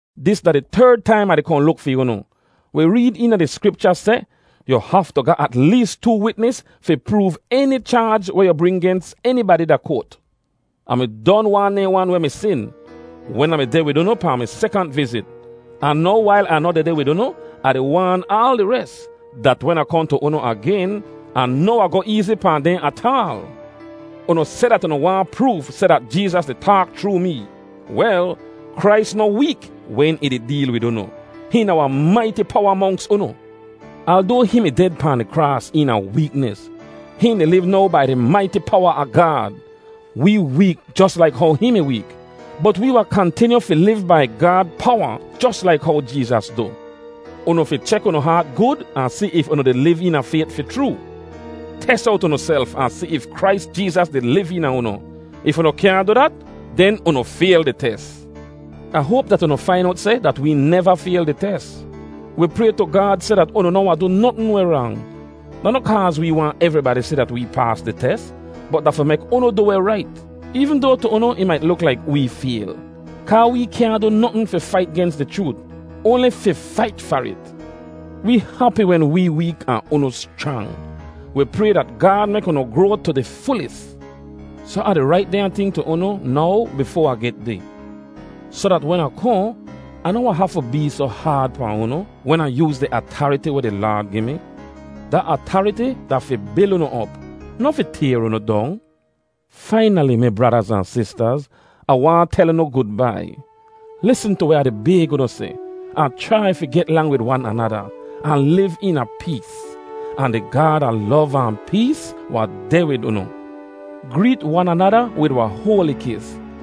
Dis da di terd taim Ah di kohn luk fi unu. Wi reed eena di Skripcha seh, “Yu haftu ga at lees too witnis fi proov eni chaaj weh yu bring gens enibadi da koat.” Ah mi don waan dehn wan weh mi sin, wen Ah mi deh wid unu pahn mi sekant vizit. Ahn now wail Ah noh dehdeh wid unu, Ah di waan aal di res, dat wen Ah kohn tu unu agen, Ah noh wahn goh eezi pahn dehn ataal. Unu seh dat unu waahn proof seh dat Jeezas di taak chroo mee. Wel, Krais noh week wen ih di deel wid unu; hihn da wahn maiti powa monks unu. Aldoa hihn mi ded pahn di kraas eena weeknis, hihn di liv now bai di maiti powa a Gaad. Wee week jos laik how hihn mi week. Bot wee wahn kantinyu fi liv bai Gaad powa jos laik how Jeezas du. Unu fi chek unu haat gud ahn si if unu di liv eena fayt fi chroo. Tes owt unuself ahn si if Krais Jeezas di liv eena unu. If unu kyaahn du dat, den unu fayl di tes. Ah hoap dat unu fain owt seh dat wee neva fayl di tes. Wi pray tu Gaad seh dat unu noh wahn du notn weh rang. Da noh kaaz wee waahn evribadi si dat wee paas di tes, bot da fi mek unu du weh rait, eevn doa tu unu ih mait luk laik wee fayl. Kaa wee kyaahn du notn fi fait gens di chroot, oanli fi fait far it. Wee hapi wen wee week ahn unu schrang. Wi pray dat Gaad mek unu groa tu di fulis. Soh Ah di rait dehnya ting tu unu now bifoa Ah get deh, soh dat wen Ah kohn, Ah noh wahn hafu bee soh haad pahn unu, wen Ah yooz di atariti weh di Laad gi mi. Da atariti da fi bil unu op, noh fi tayr unu dong. Fainali, mi bradaz ahn sistaz, Ah waahn tel unu gudbai! Lisn tu weh Ah di bayg unu seh, ahn chrai fi get lang wid wan anada, ahn liv eena pees. Ahn di Gaad a lov ahn pees wahn deh wid unu. Greet wan anada wid wahn hoali kis.